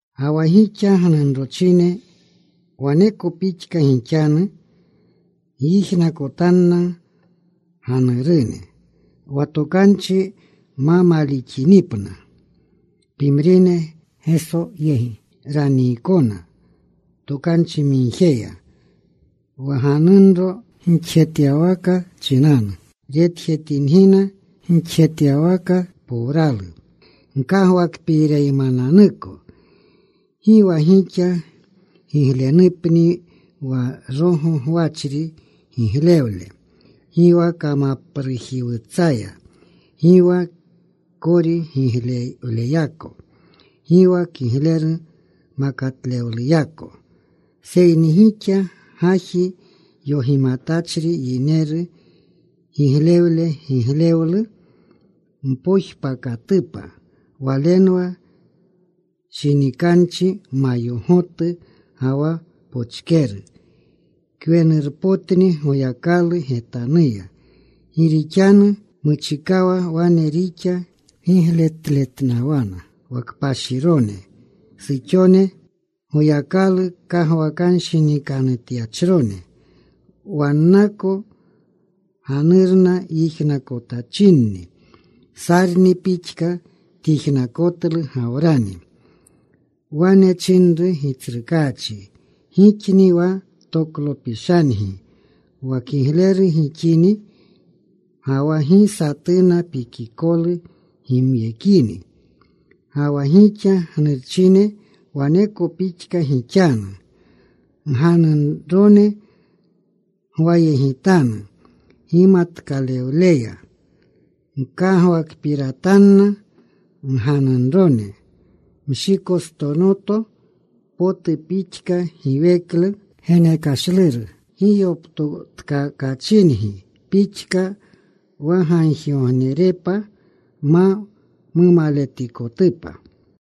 Ga wa gixa gnunrochine waneko pixka gixanu. Gyijnakotanna ganurune. Wa tokanchi ma malixinipna pimrine, Geso yegi raniikona tokanchimigjeya wa ganunro gixjetyawaka chinanu. Retjetingina gixjetyawaka powralu gkagwakpiireymananuko. Gi wa gixa giglewlepni wa rogo gwachri giglewle, gi wa kamaprujiwutsaya, gi wa kori giglewleyako, gi wa kigleru makatlewluyako. Seyni gixa gaji yogimatachri yineru giglewle, giglewlu mpojpakatupa. Walenwa shinikanchi mayogotu ga wa pochkeru. Kwenurpotni Goyakalu getanuya. Gi rixanu muchikawa wane rixa gigletletnawana wa kpashirone suxone, Goyakalu kagwakanshinikanutyachrone. Wannako ganurna yijnakotachinni. Sarni pixka tyijnakotlu Gawrani. Wane chinru gitsrukaachi. Gixni wa toklopishangi, wa kigleru gixini ga wa gi satuna pikikolu gimyekini. Ga wa gixa gnurchine waneko pixka gixanu. Ganunrone gwayegitanu gimatkalewleya. Gkagwakpiratanna ganunrone mshikostonoto potu pixka, giweklu genekashluru giyoptotkakachingi pixka. Wa gagjigognerepa ma mumaletikotupa.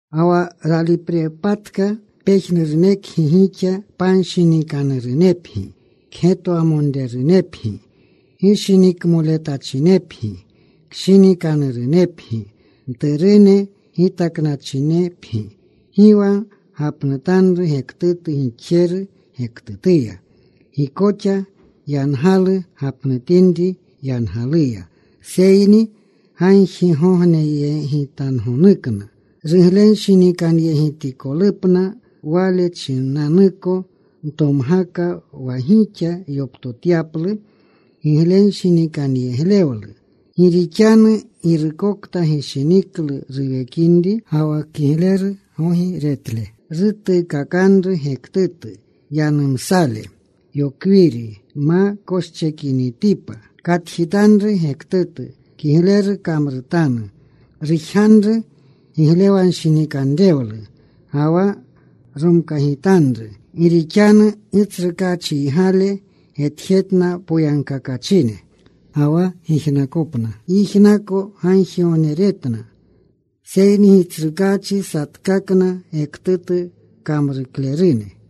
Ga wa raliprepatka, pejnurunekgi gixa panshinikanurunepgi. Kgetwamonrerunepgi. Gishinikmoletachinepgi. Kshinikanurunepgi. Mturune gitaknawachinepgi. Gi wa gapnutanru gektutu gixjeru gektutuya. Gi koxa yangalu gapnutinri yangaluya, seyni gagjiyegitangonukna ruglenshinikanyegitikolupna. Wale chinanuko ntomgaka, wa gixa yoptotyaplu giglenshinikanyeglewlu. Gi rixanu Girukokta gishiniklu ruwekinri ga wa kigleru gogi retle, rutuukakanru gektutu yanumsale, yokwiri ma koschekinitipa. Katjitanru gektutu. Kigleru kamrutanu. Rujganru giglewanshinikanrewlu ga wa romkagitanru. Gi rixanu Gitsrukaachiygale getjetna poyagkakachine, ga wa gijnakopna yijnako gagjigogneretna. Seyni Gitsrukaachi satkakna gektutu kamruklerune.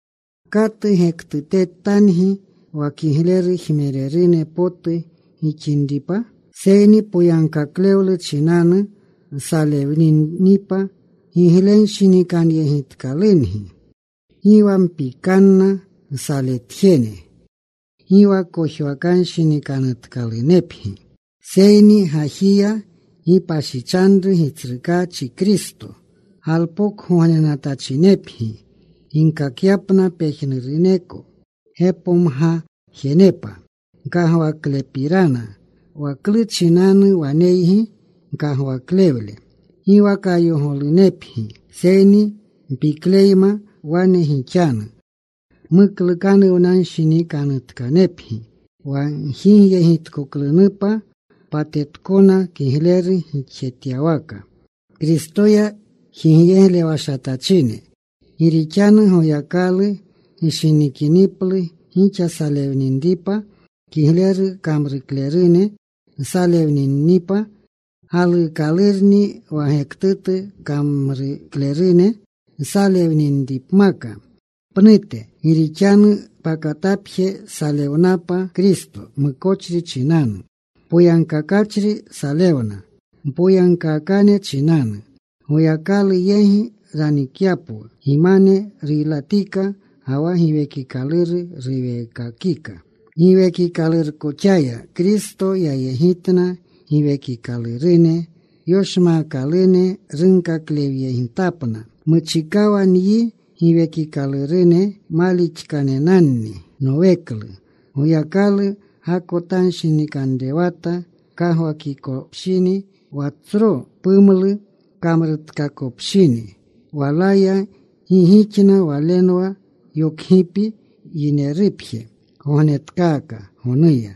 ¿Katu gektutetangi wa kigleru jmererune potu gixinipa? Seyni poyagkaklewlu chinanu nsalewninipa, giglenshinikanyegitkalungi. Gi wa mpikanna nsaletjene. Gi wa kojwakanshinikanutkalunepgi. Seyni gajiya gipashichanru Gitsrukaachi Kristo. Galpokgognenatachinepgi ginkakyapna pejnuruneko gepomgajenepa gkagwaklepirana, wa klu chinanu waneygi gkagwaklewle. Gi wa kayogolunepgi, seyni mpikleyma wane gixanu, muklukanuwnanshinikanutkanepgi, wa gjigyegitkoklunupa patetkona, kigleru gixjetyawaka Kristoya jigyeglewashatachine. Gi rixanu Goyakalu gishinikiniplu gixa salewninripa, kigleru kamruklerune nsalewninipa galuukalurni wa gektutu kamruklerune nsalewninipmaka pnute. Gi rixanu pakatapje salewnapa Kristo mukochri chinanu. Poyagkakachri salewna mpoyagkaakane chinanu, Goyakalu yegi ranikyapwu. Gimane ruylatika, ga wa Giwekikaluru ruweekakika. Giwekikalurkoxaya Kristo yayegitna giwekikalurune yoshmaakalune. Runkaklewyentapna. Muchikawa nyi giwekikalurune malixkanenanni Noweklu, Goyakalu gakotanshinikanrewata kagwakinikopshini, wa tsro pumlu kamrutkakopshini. Walaya gi gixna, walenwa yokgipi yinerupje, gognetkaaka gonuya.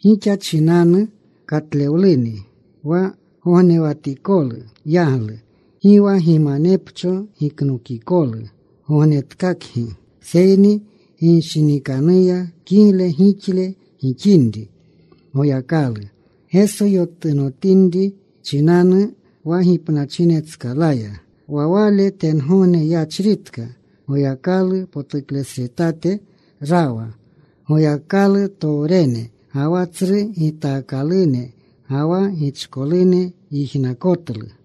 Gixa chinanu katlewluni wa gognewatikolu yaglu. Gi wa gimanepcho giknokikolu gognetkakgi, seyni ginshinikanuyna kigle gigle gixinri Goyakalu, Geso yotunotinri chinanu wa gipnachinetskalaya. Wa Wale tengogne yachritka. Goyakalu potuklesretate rawa. Goyakalutowrene ga wa tsru gitaakalune, ga wa gichkolune yijnakotlu.